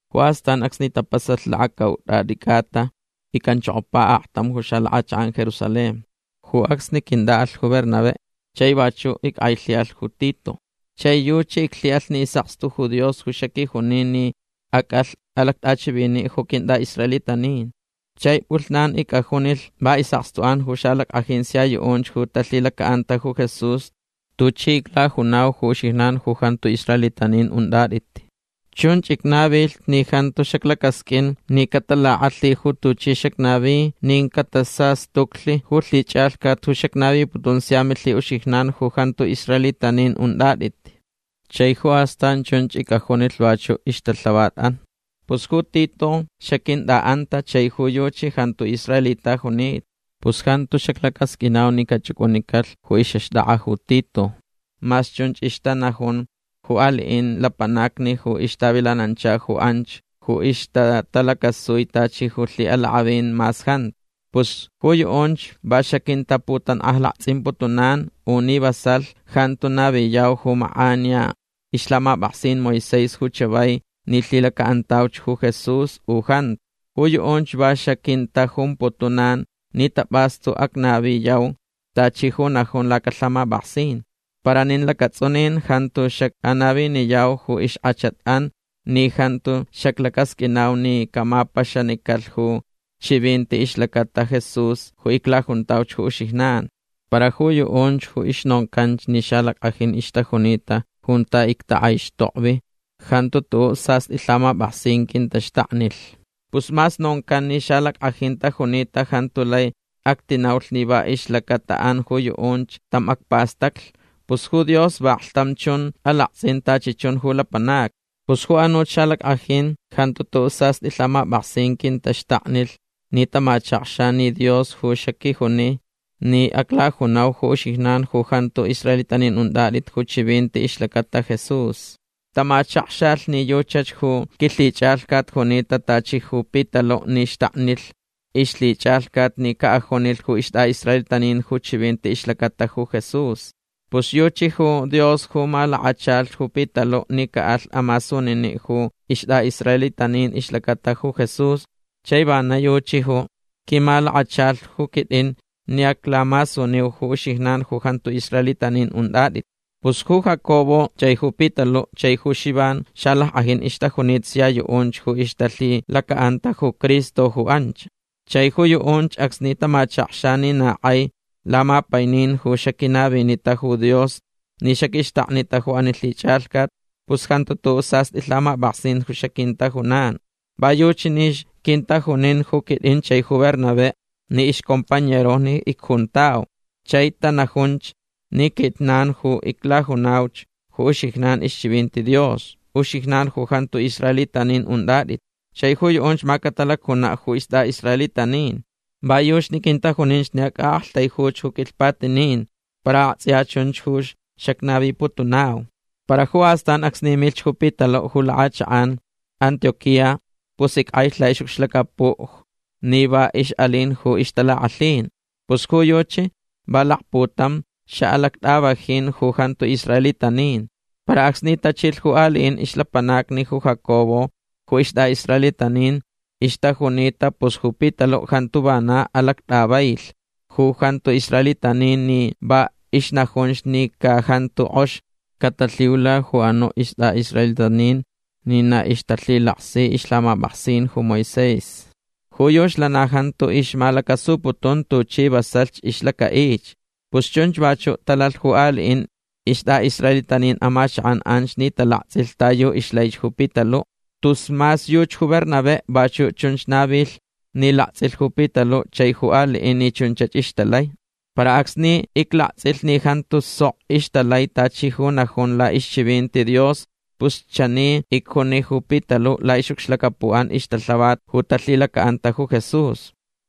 Ju astan acsni tapasalh lakacaut'at'i c'ata ic'anchokopa aktam ju lak'achak'an Jerusalén. Ju acsni quint'a'alh ju Bernabé. Chai vachu' ick'ailhi'alh ju Tito. Chai yuchi iclhi'alh ni is'akstu ju Dios ju xaquijunita ni ac'alh alact'achivini' ju quint'a'israelitanin. Chai p'ulhnan ic'ajunilh va is'akstu'an ju xalack'ajin sia yu'unch ju talhilaca'anta ju Jesús tuchi iclajunau ju uxijnan ju jantu israelitanin unt'at'it. Chunch icnavilh ni jantu xaclacasq'uin ni catalak'alhi ju tuchi xacnavi nin catasastuclh ju lhich'alhcat ju xacnaviputun sia milhi'uxijnan ju jantu israelitanin unt'at'it. Chai ju astan chunch ic'ajunilh vachu' ixtalhavat'an. Pus ju Tito xaquint'a'anta chai ju yuchi jantu israelita junita. Pus jantu xaclacasq'uinau ni cach'uc'unicalh ju ix'axt'ak'a ju Tito mas chunch ixtanajun ju ali'in lapanacni ju ixtavilanancha anch ju ixtatalacasui tachi ju lhi'alak'avinch mas jantu. Pus ju yu'unch va xaquintaputank'ajlakts'imputunan u ni vasalh jantu naviyau ju mak'aniya ixlhamap'aksin Moisés ju chavai ni lhilaca'antauch ju Jesús u jantu. Ju yu'unch va xaquintajumputunan ni tap'astu acnaviyau tachi ju najun lacalhamap'aksin. Para nin lacats'unin jantu xac'anaviniyau ju ixk'achat'an ni jantu xaclacasq'uinau ni camapaxanicalh ju chivinti ixlacata ju Jesús ju iclajuntauch ju uxijnan. Para ju yu'unch ju ixnoncanch ni xalack'ajin ixtajunita junta ictak'aixtokvi jantu tu'u' sast'i lhamap'aksin quintaxtaknilh. Pus mas noncan ni xalack'ajin tajunita jantu lai actinaulh ni va ixlacata'an ju yu'unch tam acpastaclh. Pus ju Dios vaklhtam chun alakts'in tachi chun ju lapanacni. Pus ju anuch xalack'ajin jantu tu'u' sast'i lhamap'aksin quintaxtaknilh ni tamachakxa ni Dios ju xaquijunita ni aclajuniu ju uxijnan ju jantu israelitanin unt'at'it ju chivinti ixlacata Jesús. Tamachakxalh ni yuchach ju quilhich'alhcat junita tachi ju Pitalu' ni xtaknilh ixlhich'alhcat ni ca'ajunilh ju ist'a'israelitanin ju chivinti ixlacata Jesús. Pus yuchi ju Dios ju malakachalh ju Pitalu' ni ca'alh amasunini' ju ist'a'israelitanin ixlacata ju Jesús chai vana yuchi ju quimalakachalh ju quit'in ni aclamasuniu ju uxijnan ju jantu israelitanin unt'at'it. Pus ju Jacobo chai ju Pitalu' chai ju Xivan xalack'ajin ixtajunita sia yu'unch ju ixtalhilaca'anta ju Cristo ju anch. Chai ju yu'unch acsni tamachakxa ni na k'ai lamapainin ju xaquinavinita ju Dios ni xaquixtaknita ju ani lhich'alhcat pus jantu tu'u' sast'i lhamap'aksin ju xaquintajunan. Va yuchi ni quintajunin ju quit'in chai ju Bernabé ni ixcompañerojni icjuntau. Chai tanajunch ni quijnan ju aclajunauch ju uxijnan ixchivinti Dios. Uxijnan ju jantu israelitanin unt'at'it. Chai ju yu'unch ma catalacjuna' ju ist'a'israelitanin'an. Va yuchi ni quintajuninch ni ac'a'aktaijuyauch ju quilhpatinin para akts'iya chunchach ju xacnaviputunau. Para ju astan acsni milhch ju Pitalu' ju lak'achak'an Antioquía pus ick'ailh la'ix'ucxlacapu' ni va ix'alin ju ixtalak'alhin. Pus ju yuchi va lakputam xa'alact'avajin ju jantu israelitanin. Para acsni tachilh ju ali'in ixlapanacni ju Jacobo ju ist'a'israelitanin ixtajunita pus ju Pitalu' jantu vana alact'availh ju jantu israelitanin ni va ixnajunch ni ca jantu k'ox catalhiula ju anu' ist'a'israelitanin ni na ixtalhilaksi ixlhamap'aksin ju Moisés. Ju yuchi lana jantu ixmalacasuputun tuchi vasalhch ixlaca'ich. Pus chunch vachu' talalh ju ali'in ist'a'israelitanin amachak'an anch ni talakts'ilh ta yu ixlaich ju Pitalu'. Tus mas yuchi ju Bernabé vachu' chunch navilh ni lakts'ilh ju Pitalu' chai ju ali'in ni chunchach ixtalai. Para acsni iclakts'ilh ni jantu sok ixtalai tachi ju najun la'ixchivinti Dios pus chani icjuni ju Pitalu' la'ix'ucxlacapu'an ixtalhavat ju talhilaca'anta Jesús: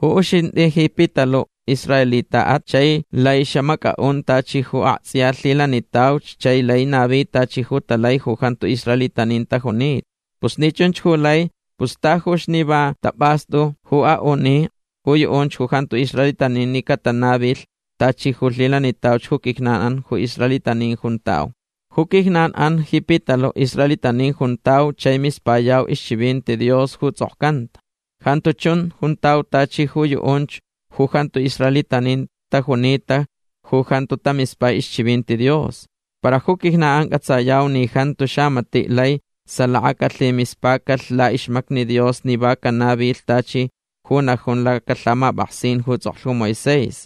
“Ju uxint'i ji Pitalu' israelita'at chai lai xamac'a'un tachi ju akts'iya lhilanitauch chai laich navi tachi ju talai ju jantu israelitanin tajunita. Pus ni chunch ju lai pus tajuch ni va tap'astu ju a'uni ju yu'unch ju jantu israelitanin ni catanavilh tachi ju lhilanitauch ju quijnan'an ju israelitanin juntau.” Ju quijnan'an ji Pitalu' israelitanin juntau chai mispayau ixchivinti Dios ju ts'okcanta. Jantu chun juntau tachi ju yu'unch ju jantu israelitanin tajunita ju jantu tamispai ixchivinti Dios. Para ju quijnan'an c'atsayau ni jantu xamati' lai salaka calhimispacalh la'ixmacni Dios ni va canavilh tachi ju najun lacalhamap'aksin ju ts'oklh ju Moisés.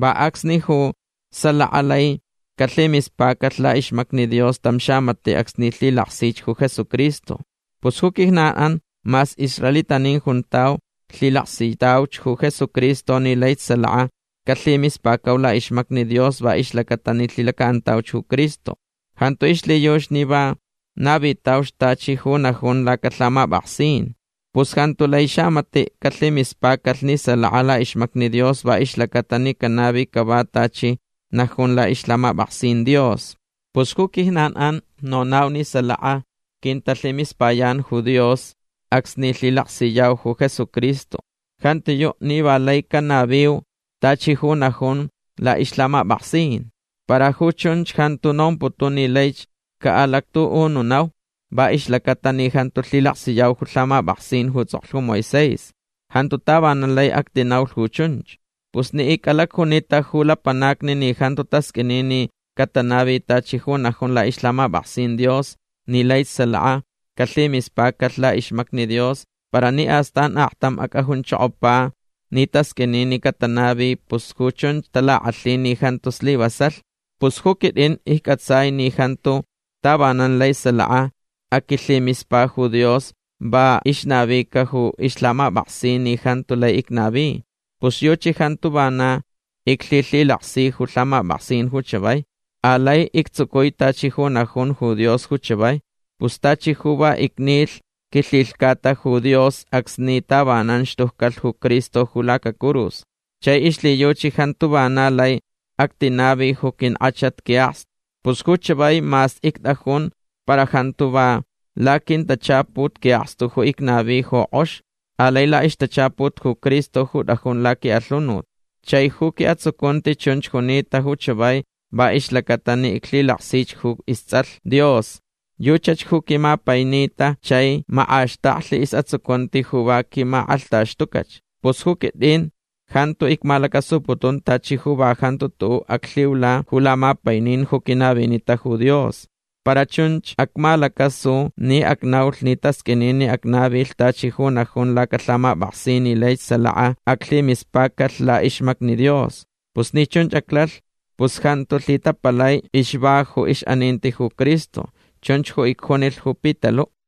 Va acsnich ju salaka lai calhimispacalh la'ixmacni Dios tam xamati' acsni lhilaksich ju Jesucristo. Pus ju quijnan'an mas israelitanin juntau lhilaksitauch ju Jesucristo ni laich salaka calhimispacau la'ixmacni Dios va ixlaca'atalh ni lhilaksitauch ju Cristo. Jantu ixlhiyuchi ni va navitauch tachi ju najun lacalhamap'aksin. Pus jantu lai xamati' calhimispacalh ni salaka la'ixmacni Dios va ixlaca'atalh ni canavi cava tachi ju najun la'ixlhamap'aksin Dios. Pus ju quijnan'an nonau ni salaka quintalhimispayan ju Dios acsni lhilaksiyau ju Jesucristo. Jantiyu' ni va lai canaviu tachi ju najun la'ixlhamap'aksin. Para ju chunch jantu nomputun ni laich ca'alactu'ununau va ixlaca'atalh ni jantu lhilaksiyau ju lhamap'aksin ju ts'oklh ju Moisés. Jantu tavanan lai actinaulh ju chunch. Pus ni ic'alacjunita ju lapanacni ni jantu tasq'uini ni catanavi tachi ju najun la'ixlhamap'aksin Dios ni laich salaka calhimispacalh la'ixmacni Dios para ni astan aktam ac'ajunchokopa ni tasq'uini ni catanavi pus ju chunch talak'alhin ni jantu slivasalh. Pus ju quit'in icc'atsai ni jantu tavanan lai salaka aquilhimispa ju Dios va la'ixnavica ju ixlhamap'aksin ni jantu lai icnavi. Pus yuchi jantu vana iclhilhilaksi ju lhamap'aksin ju chavai. Alai ictsucui tachi ju najun ju Dios ju chavai. Pus tachi ju va icnilh quilhilhcata ju Dios acsni tavanan xtuccalh ju Cristo ju lacacurus. Chai ixlhiyuchi jantu vana lai actinavi ju quink'achat qui'akstu. Pus ju chavai mas ict'ajun para jantu va laquintachaput qui'akstu ju icnavi ju k'ox. Alai la'ixtachaput ju Cristo ju t'ajun laqui'alhunut. Chai ju qui'atsucunti chunch junita ju chavai va ixlaca'atalh ni iclhilaksich ju ists'alh Dios. Yuchach ju quimapainita chai mak'axtaklh is'atsucunti ju va quimak'alhtaxtucach. Pus ju quit'in jantu icmalacasuputun tachi ju va jantu tu'u' aclhiula ju lamapainin ju quinavinita ju Dios. Para chunch acmalacasu ni acnaulh ni tasq'uini ni acnavilh tachi ju najun lacalhamap'aksin ni laich salaka aclhimispacalh la'ixmacni Dios. Pus ni chunch aclalh pus jantu lhitapalai ixva ju ix'aninti ju Cristo. Chunch ju icjunilh ju Pitalu'.